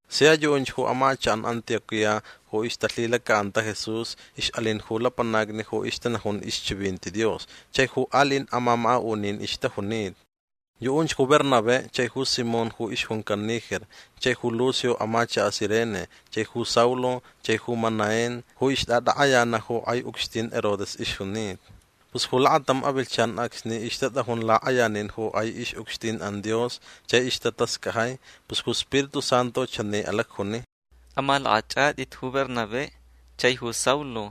Sia yuʼunch amachakʼan Antioquía ju ixtalhilacaʼanta Jesús ixʼalin ju lapanacni ju ixtanajun ixchivinti Dios chai ju aliʼin amamakaʼunin ixtajunita. Yuʼunch ju Bernabé chai ju Simón ju ixjuncan Niger chai ju Lucio amachakaʼ Cirene chai ju Saulo chai ju Manaén ju ixtʼatakʼayanaʼ ju kʼai ucxtin Herodes ixjunita. Pus ju lakatam avilhchan acsni ixtatʼajun lakʼayanin ju kʼai ixʼucxtinʼan Dios chai ixtatascajai pus ju Spiritu Santu chani alacjuni: ―Amalakʼachʼatʼit ju Bernabé chai ju Saulo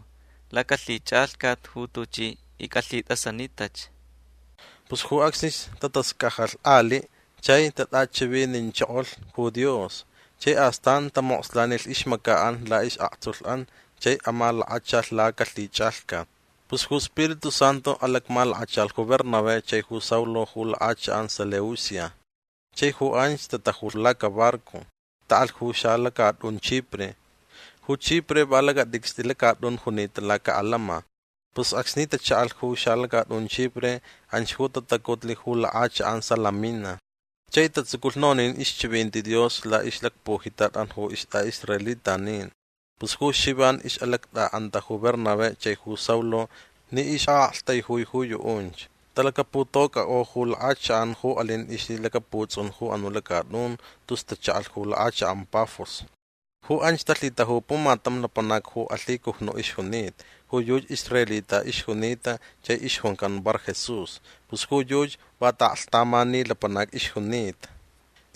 lacalhichʼalhcat ju tuchi icʼalhitʼasanitach. Pus ju acsnich tatascajalh aliʼ chai tatʼachivinichokolh ju Dios. Chai astan tamokslanilh ixmacaʼan laʼisʼaktsulhʼan chai amalakachalh lacalhichʼalhcat. Pus ju Spiritu Santu alacmalakachalh ju Bernabé chai ju Saulo ju lakʼachakʼan Seleucia. Chai ju anch tatajulh lacabarco. Taʼalh ju xalacatʼun Chipre. Ju Chipre va lacatʼicstʼi lacatʼun junita lacaʼalama. Pus acsni tachaʼalh ju xalacatʼun Chipre anch ju tatacutlh ju lakʼachakʼan Salamina. Chai tatsuculh nonin ixchivinti Dios laʼixlacpujitatʼan ju istʼaʼisraelitanin. Pus ju Xivan ixʼalactʼaʼanta ju Bernabé chai ju Saulo ni ixʼaʼaktaijui ju yuʼunch. Talacaputocʼakʼo ju lakʼachakʼan ju alin ixlhilacaputsʼun ju anuʼ lacatʼun tus tachaʼalh ju lakʼachakʼan Pafos. Ju anch talhitaju pumatam lapanac ju alhicujnuʼ ixjunita. Ju yuchi israelita ixjunita chai ixjuncan Barjesús. Pus ju yuchi va taʼaklhtamani lapanac ixjunita.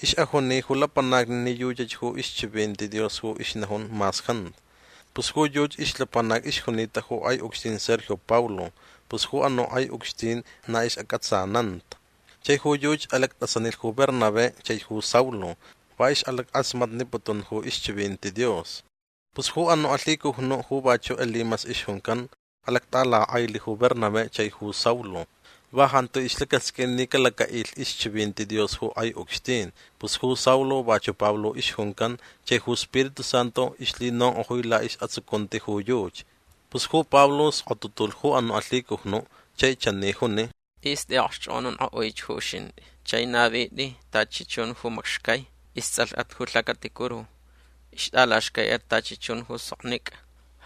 Ixʼajuni ju lapanacni ni yuchach ixchivinti Dios ju ixnajun mas jantu. Pus ju yuchi ixlapanac ixjunita ju kʼai ucxtin Sergio Paulo. Pus ju anuʼ kʼai ucxtin na ixʼacʼatsananta. Chai ju yuchi alactʼasanilh ju Bernabé chaich ju Saulo. Va ixʼalackʼasmatniputun ju ixchivinti Dios. Pus ju anuʼ alhicujnuʼ ju vachuʼ Elimas ixjuncan alactʼalakʼailh ju Bernabé chaich ju Saulo. Va jantu ixlacasqʼuin ni calacaʼilh ixchivinti Dios ju kʼai ucxtin. Pus ju Saulo vachuʼ Pablo ixjuncan chai ju Spiritu Santu ixlhinonkʼojui laʼisʼatsucunti ju yuchi. Pus ju Pablo skotutulh ju anuʼ alhicujnuʼ. Chai chani juni: ―Tʼis tʼiʼaʼokxchʼokʼonankʼoʼuich ju uxintʼi. Chai navitʼi tachi chun ju macxcai. Istsʼalhʼat ju lhacaticuru. Ixtʼalaxcaiʼat tachi chun ju soknicʼa.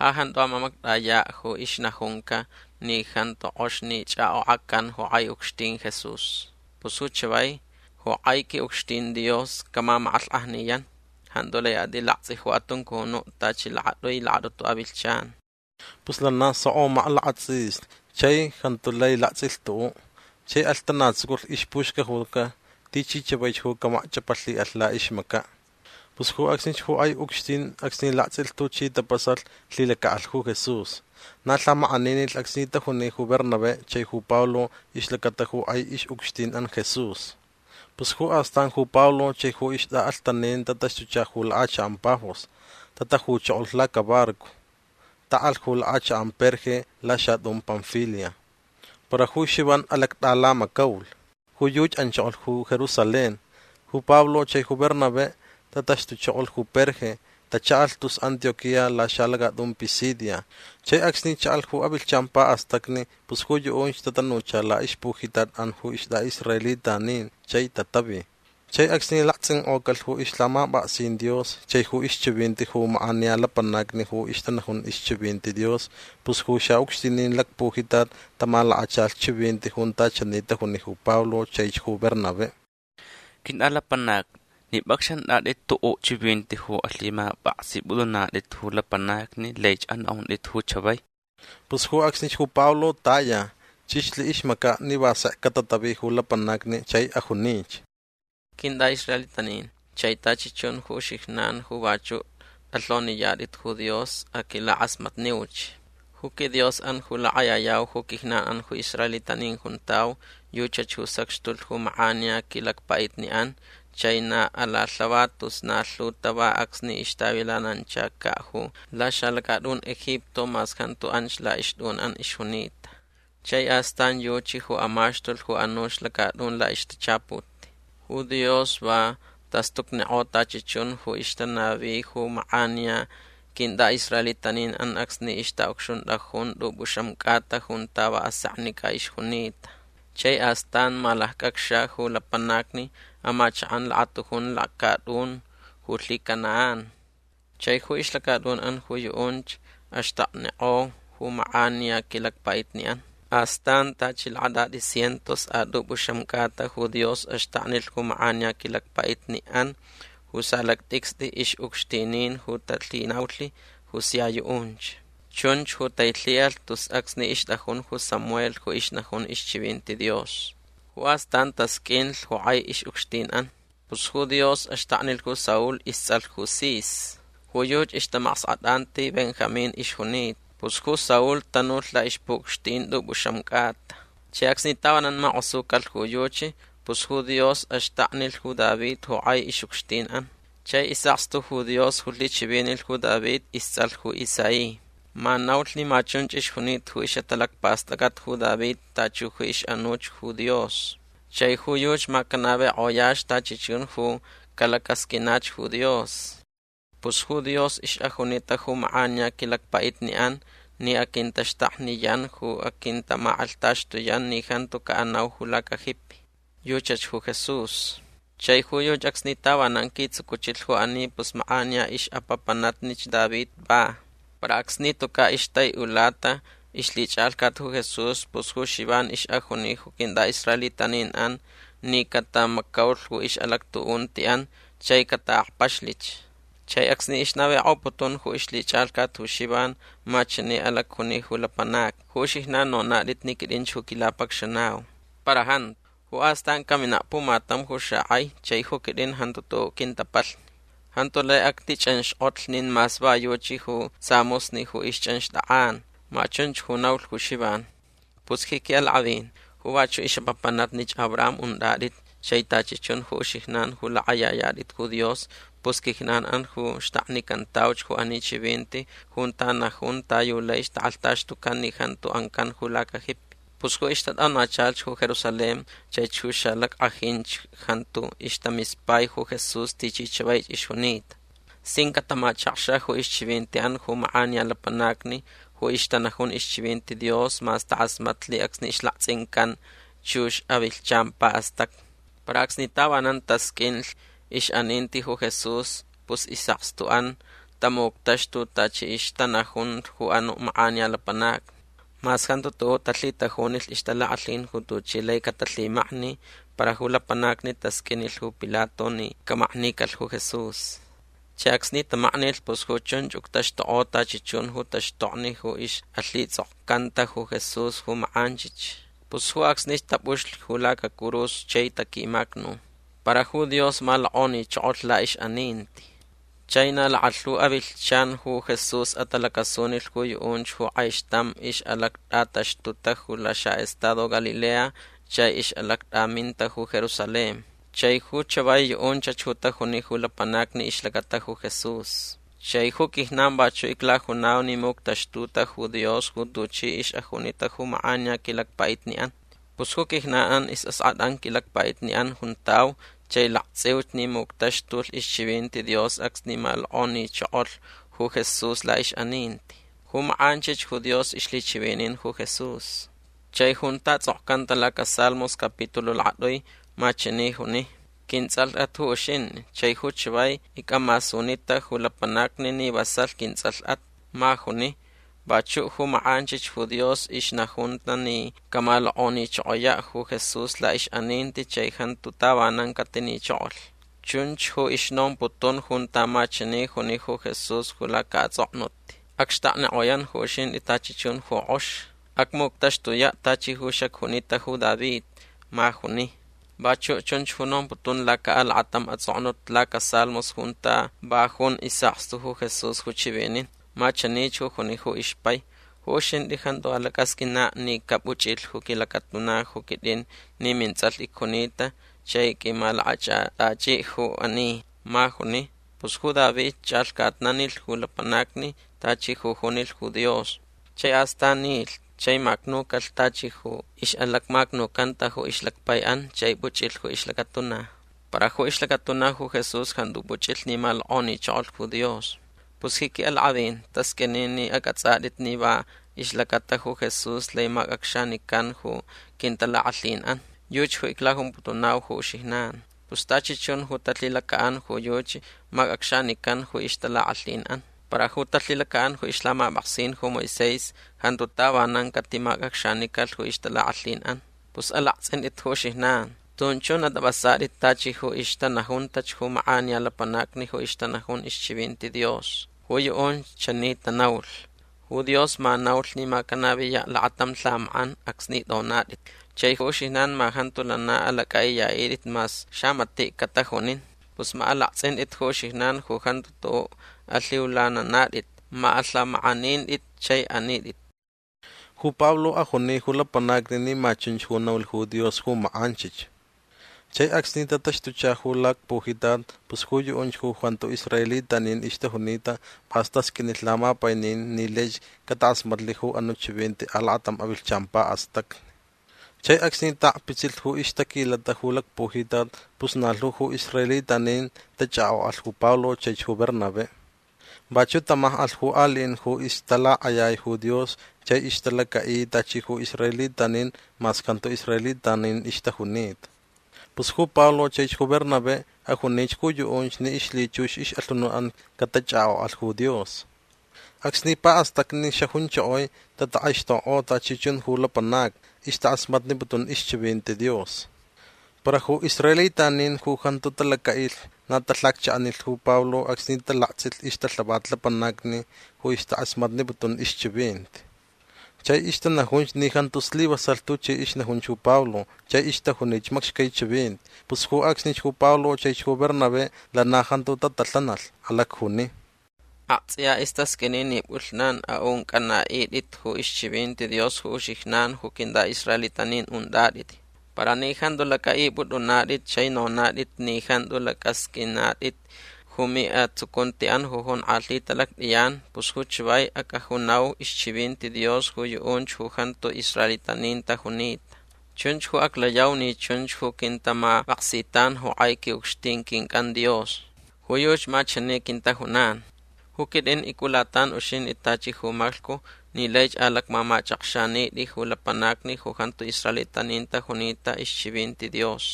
Ja jantu amamactʼayaʼ ju ixnajunca ni jantu kʼox ni chʼakʼokʼacan ju kʼai ucxtin Jesús. Pus ju chavai ju kʼai quiʼucxtin Dios camamakʼalhkʼajniyan. Jantu lai atʼilaktsʼi ju atuncunuʼ tachi lakatʼui lakatʼutu avilhchan. Pus lana soko maklakatsʼislh chai jantu lai laktsʼilh tuʼuʼ. Chai alhtanatsuculh ixpuxcajuca tichi chavaich ju camakchʼapalhiʼalh laʼixmacaʼ. Pus ju acsnich ju kʼai ucxtin acsni laktsʼilh tuchi tapasalh lhilacaʼalh ju Jesús. Na lhamakʼaninilh acsni tajuni ju Bernabé chai ju Pablo ixlacata ju kʼai ixʼucxtinʼan Jesús. Pus ju astan ju Pablo chai ju ixtʼaʼalhtanin tataxtucha ju lakʼachakʼan Pafos. Tatajuchokolh lacabarco. Taʼalh ju lakʼachakʼan Perge laxatʼun Panfilia. Para ju Xivan alactʼalamacaulh. Ju yuchi anchokolh ju Jerusalén. Ju Pablo chai ju Bernabé tataxtuchokolh ju Perge. Tachaʼalh tus Antioquía laxalacatʼun Pisidia. Chai acsni chaʼalh ju avilhchan paʼastacni pus ju yuʼunch tatanucha laʼixpujitatʼan ju istʼaʼisraelitanin chai tatavi. Chai acsni laktsʼinkʼocalh ju ixlhamapʼaksin Dios chai ju ixchivinti ju makʼaniya lapanacni ju ixtanajun ixchivinti Dios pus ju xaʼucxtinin lacpujitat tamalakachalh chivinti junta chani tajuni ju Pablo chaich ju Bernabé: ―Quintʼalapanacni ni pʼacxantʼatʼit tuʼuʼ chivinti ju alhimapʼaksipʼutʼunatʼit ju lapanacni laich anaʼuntʼit ju chavai. Pus ju acsnich ju Pablo taya. Chʼixlh ixmacaʼ ni va sek catatavi ju lapanacni chai ajunich: ―Quintʼaʼisraelitanin chai tachi chun ju uxijnan ju vachuʼ tʼalhoniyatʼit ju Dios aquilakʼasmatniuch. Ju quiDiosʼan ju lakʼayayau ju quijnanʼan ju israelitanin juntau yuchach ju sacxtulh ju makʼaniya quilacpaʼitniʼan chai na alalhava tus na lhu tava acsni ixtavilananchacaʼ ju laxalacatʼun Egipto mas jantu anch laʼixtʼunʼan ixjunita. Chai astan yuchi ju amaxtulh ju anuch lacatʼun laʼixtachaput. Ju Dios va tastucnikʼo tachi chun ju ixtanavi ju makʼaniya quintʼaʼisraelitaninʼan acsni ixtaʼucxuntʼajun tʼupʼuxam cʼata junta va aseknicʼa ixjunita. Chai astan malaccʼacxa ju lapanacni amachakʼan lakatujun lacatʼun ju lhiCanaán. Chai ju ixlacatʼunʼan ju yuʼunch axtaknikʼo ju makʼaniya quilacpaʼitniʼan. Astan tachi lakatʼatʼi cientos a tʼupʼuxam cʼata ju Dios axtaknilh ju makʼaniya quilacpaʼitniʼan ju xalactʼicstʼi ixʼucxtinin ju talhinaulh ju sia yuʼunch. Chunch ju tailhiʼalh tus acsni ixtʼajun ju Samuel ju ixnajun ixchivinti Dios. Ju astan tasqʼuinlh ju kʼai ixʼucxtinʼan. Pus ju Dios axtaknilh ju Saul istsʼalh Cis. Ju yuchi ixtamaskʼatʼanti Benjamín ixjunita. Pus ju Saul tanulh laʼixpuʼucxtin tʼupʼuxam cʼata. Chai acsni tavanan makʼosucalh ju yuchi pus ju Dios axtaknilh ju David ju kʼai ixʼucxtinʼan. Chai isʼakstu ju Dios ju lhichivinilh ju David istsʼalh ju Isaí. Ma naulh ni ma chunch ixjunita ju ixʼatalacpastʼacʼat ju David tachi ju ixʼanuch ju Dios. Chai ju yuchi ma canavikʼoyach tachi chun ju calacasqʼuinach ju Dios. Pus ju Dios ixʼajunita ju makʼaniya quilacpaʼitniʼan ni aquintaxtakniyan ju aquintamakʼalhtaxtuyan ni jantu caʼanau ju lacajipi. Yuchach ju Jesús. Chai ju yuchi acsni tavanan quitsucuchilh ju ani pus makʼaniya ixʼapapanatnich David va. Para acsni tucaʼ ixtaiʼulata ixlhichʼalhcat ju Jesús pus ju Xivan ixʼajuni ju quintʼaʼisraelitaninʼan ni catamacaulh ju ixʼalactuʼuntiʼan chai cataʼakpaxlich. Chai acsni ixnavikʼoputun ju ixlhichʼalhcat ju Xivan ma chani alacjuni ju lapanacni: “Ju uxijnan nonatʼit ni quitʼinch ju quilapacxanau. Para jantu. Ju astan caminaʼ pumatam ju xakʼai chai ju quitʼin jantu tuʼuʼ quintapalhni. Jantu lai actichʼanxkʼotlh nin mas va yuchi ju samusni ju ixchʼanxtʼakʼan”. Ma chunch ju naulh ju Xivan. Pus ji quiʼalakʼavin ju vachuʼ ixʼapapanatnich Abraham untʼatʼit chai tachi chun ju uxijnan ju lakʼayayatʼit ju Dios pus quijnanʼan ju xtaknicantauch ju ani chivinti junta najun ta yu lai takʼalhtaxtucan ni jantu ancan ju lacajipi. Pus ju ixtatʼonachalhch ju Jerusalén chaich ju xalackʼajinch jantu istamispaich ju Jesús tichi chavaich ixjunita. Sin catamachakxa ju ixchivintiʼan ju makʼaniya lapanacni ju ixtanajun ixchivinti Dios mas takʼasmatlh acsni ixlaktsʼincan chux avilhchan paʼastacni. Para acsni tavanan tasqʼuinlh ixʼaninti ju Jesús pus isʼakstuʼan tamuctaxtulh tachi ixtanajun ju anuʼ makʼaniya lapanacni. Mas jantu tuʼuʼ talhitajunilh ixtalakʼalhin ju tuchi lai catalhimakni para ju lapanacni tasqʼuinilh ju Pilato ni camaknicalh ju Jesús. Chai acsni tamaknilh pus ju chunch uctaxtukʼo tachi chun ju taxtokni ju ixʼalhitsʼokcanta ju Jesús ju makʼanchich. Pus ju acsnich tapʼuxlh ju lacacurus chai taquimacnu. Para ju Dios malokʼonichokolh laʼixʼaninti. Chai na lakalhu avilhchan ju Jesús atalacasunilh ju yuʼunch ju kʼaixtam ixʼalactʼataxtuta ju laxaʼestado Galilea chai ixʼalactʼaminta ju Jerusalén. Chai ju chavai yuʼunch ju tajuni ju lapanacni ixlacata ju Jesús. Chai ju quijnan vachuʼ iclajunau ni muctaxtuta ju Dios ju tuchi ixʼajunita ju makʼaniya quilacpaʼitniʼan. Pus ju quijnanʼan isʼaskʼatʼan quilacpaʼitniʼan juntau chai laktsʼiuch ni muctaxtulh ixchivinti Dios acsni malokʼonichokolh ju Jesús laʼixʼaninti. Ju makʼanchich ju Dios ixlhichivinin ju Jesús. Chai junta tsʼokcanta lacasalmos capitaluʼ lakatʼui ma chani juni: “Quintsʼalhʼat ju uxintʼi chai ju chavai icʼamasunita ju lapanacni ni vasalh quintsʼalhʼat”. Ma juni. Vachuʼ ju makʼanchich ju Dios ixnajunta ni camalokʼonichokoyaʼ ju Jesús laʼixʼaninti chai jantu tavanan catinichokolh. Chunch ju ixnomputun junta ma chani juni ju Jesús ju lacaʼatsʼoknut: “Acxtaknikʼoyan ju uxintʼi tachi chun ju kʼox. Acmuctaxtuyaʼ tachi ju xacjunita ju David”. Ma juni. Vachuʼ chunch ju nomputun lacaʼalakatam atsʼoknut lacasalmos junta va jun isʼakstu ju Jesús ju chivinin. Ma chanich ju juni ju ixpai: “Ju uxintʼi jantu alacʼasqʼuinaʼ ni capuchʼilh ju quilacatuna ju quitʼin ni mintsʼalh icjunita chai qʼuimalakʼachʼatʼachiʼ ju ani”. Ma juni. Pus ju David chʼalhcatnanilh ju lapanacni tachi ju junilh ju Dios. Chai astan nilh chai macnucalh tachi ju ixʼalacmacnucanta ju ixlacpaiʼan chai puchʼilh ju ixlacatuna. Para ju ixlacatuna ju Jesús jantu puchʼilh ni malokʼonichokolh ju Dios. Pus ji quiʼalakʼavin tasqʼuini ni acʼatsʼatʼit ni va ixlacata ju Jesús lai macʼacxanican ju quintalakʼalhinʼan. Yuchi ju iclajumputunau ju uxijnan. Pus tachi chun ju talhilacaʼan ju yuchi macʼacxanican ju ixtalakʼalhinʼan. Para ju talhilacaʼan ju ixlhamapʼaksin ju Moisés jantu tavanan catimacʼacxanicalh ju ixtalakʼalhinʼan. Pus alaktsʼintʼit ju uxijnan. Tun chun atʼapʼasatʼit tachi ju ixtanajuntach ju makʼaniya lapanacni ju ixtanajun ixchivinti Dios. Ju yuʼunch chani tanaulh: Ju Dios ma naulh ni ma canaviyaʼ lakatam lhamakʼan acsni tʼonatʼit. Chai ju uxijnan ma jantu lana alacʼaʼiyaʼitʼit mas xamatiʼ catajunin. Pus ma alaktsʼintʼit ju uxijnan ju jantu tuʼuʼ alhiulananatʼit. Ma alhamakʼanintʼit chai anitʼit. Ju Pablo ajuni ju lapanacni ni ma chunch ju naulh ju Dios ju makʼanchich. Chai acsni tataxtucha ju lacpujitat pus ju yuʼunch ju jantu israelitanin ixtajunita pʼas tasqʼuinlh lamapainin ni laich catakʼasmatlh ju anuʼ chivinti alakatam avilhchan paʼastacni. Chai acsni taʼakpitsilh ju ixtaquilata ju lacpujitat pus na lhu ju israelitanin tachʼakʼokʼalh ju Pablo chaich ju Bernabé. Vachuʼ tamakʼalh ju aliʼin ju ixtalakʼayai ju Dios chai ixtalacaʼi tachi ju israelitanin mas jantu israelitanin ixtajunita. Pus ju Pablo chaich ju Bernabé ajunich ju yuʼunch ni ixlhichux ixʼalhunutʼan catachʼakʼokʼalh ju Dios. Acsni paʼastacni xajunchokoi tatakʼaixtokkʼo tachi chun ju lapanacni. Ixtakʼasmatniputun ixchivinti Dios. Para ju israelitanin ju jantu talacaʼilh na talhacchaʼanilh ju Pablo acsni talaktsʼilh ixtalhavat lapanacni ju ixtakʼasmatniputun ixchivinti. Chai ixtanajunch ni jantu slivasalh tuchi ixnajunch ju Pablo chai ixtajunich macxcai chivinti. Pus ju acsnich ju Pablo chaich ju Bernabé lana jantu tatalhanalh. Alacjuni: ―Aktsʼiya istasqʼuini ni pʼulhnan aʼuncʼanaʼitʼit ju ixchivinti Dios ju uxijnan ju quintʼaʼisraelitanin untʼatʼit. Para ni jantu lacʼaʼipʼutʼunatʼit chai nonatʼit ni jantu lacʼasqʼuinatʼit ju miʼatsucuntiʼan ju jonkʼalhita lactʼiyan pus ju chavai acʼajunau ixchivinti Dios ju yuʼunch ju jantu israelitanin tajunita. Chunch ju aclayau ni chunch ju quintamapʼaksitan ju kʼai quiʼucxtin quincʼan Dios. Ju yuchi ma chani quintajunan: Ju quitʼin icʼulatan uxintʼi tachi ju maclhcu ni laich alacmamachʼakxanitʼi ju lapanacni ju jantu israelitanin tajunita ixchivinti Dios.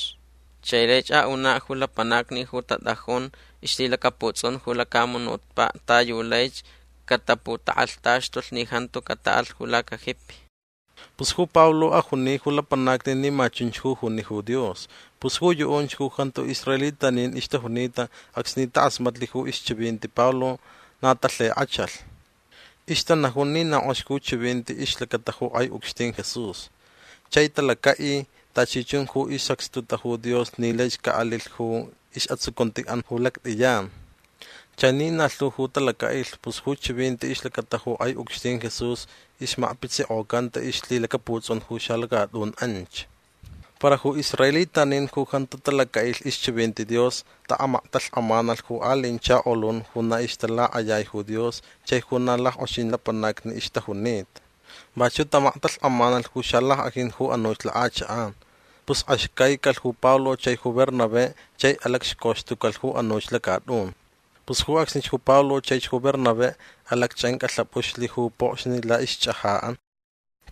Chai laich aʼunaʼ ju lapanacni ju tatʼajun ixlhilacaputsʼun ju lacamunutpaʼ ta yu laich cataputakʼalhtaxtulh ni jantu cataʼalh ju lacajipi. Pus ju Pablo ajuni ju lapanacni ni ma chunch ju juni ju Dios. Pus ju yuʼunch ju jantu israelitanin ixtajunita acsni takʼasmatlh ju ixchivinti Pablo na talhikʼachalh. Ixtanajun ni na kʼox ju chivinti ixlacata ju kʼai ucxtin Jesús. Chai talacaʼi tachi chun ju isacxtuta ju Dios ni laich caʼalilh ju isʼatsucuntiʼan ju lactiyan. Chai ni na lhu ju talacaʼilh pus ju chivinti ixlacata ju kʼai ucxtin Jesús ixmakpitsikʼocanta ixlhilacaputsʼun ju xalacatʼun anch. Para ju israelitanin ju jantu talacaʼilh ixchivinti Dios taʼamaktalhkʼamanalh ju aliʼin chakolun ju na ixtalakʼayai ju Dios chai ju na lackʼoxin lapanacni ixtajunita. Vachuʼ tamaktalhkʼamalh ju xalackʼajin ju anuch lakʼachakʼan. Pus axcaicalh ju Pablo chai ju Bernabé chai alacxcauxtucalh ju anuch lacatʼun. Pus ju acsnich ju Pablo chaich ju Bernabé alacchʼancʼalhapʼuxlh ju pokxni laʼixchʼajaʼan.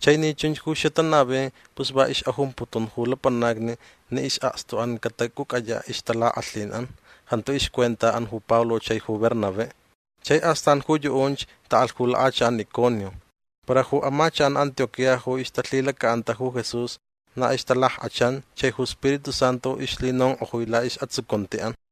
Chai ni chunch ju xatanavi pus va ixʼajumputun ju lapanacni ni isʼakstuʼan catacʼucʼayaʼ ixtalakʼalhinʼan. Jantu ixcuentaʼan ju Pablo chai ju Bernabé. Chai astan ju yuʼunch taʼalh ju lakʼachakʼan Iconio. Para ju amachakʼan Antioquía ju ixtalhilacaʼanta ju Jesús na ixtalackʼachan chai ju Spiritu Santu ixlhinonkʼojui laʼisʼatsucuntiʼan.